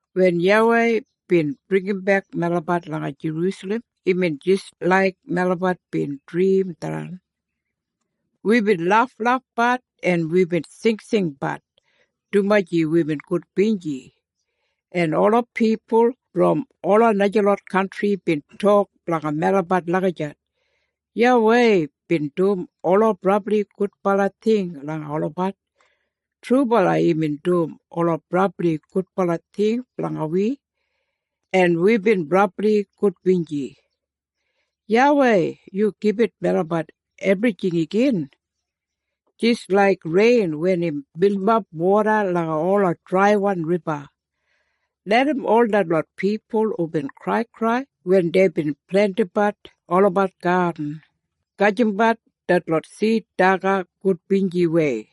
Wen YAWEI bin bringimbek melabat langa Jerusalem imbin jis laik melabat bin drim tharran. Wibin laflafbat en wibin singsingbat dumaji wibin gudbinji. En ola pipul brom ola najalot kantri bin tok blanga melabat lagijat, “YAWEI bin dum ola brabli gudbala ting langa olabat.” Trubala imbin dum ola brabli gudbala ting blanga wi, en wibin brabli gudbinji! YAWEI, yu gibit melabat ebrijing igin, jis laik rein wen im bilimap woda langa ola draiwan riba. Larram ol detlot pipul hubin kraikrai wen deibin plentimbat olabat gadin, gajimbat detlot sid daga gudbinjiwei.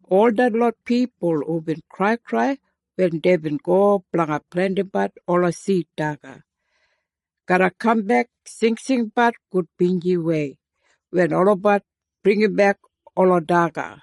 Ol detlot pipul hubin kraikrai wen deibin go blanga plentimbat ola sid daga, garra kambek singsingbat gudbinjiwei wen olabat bringimbek ola daga.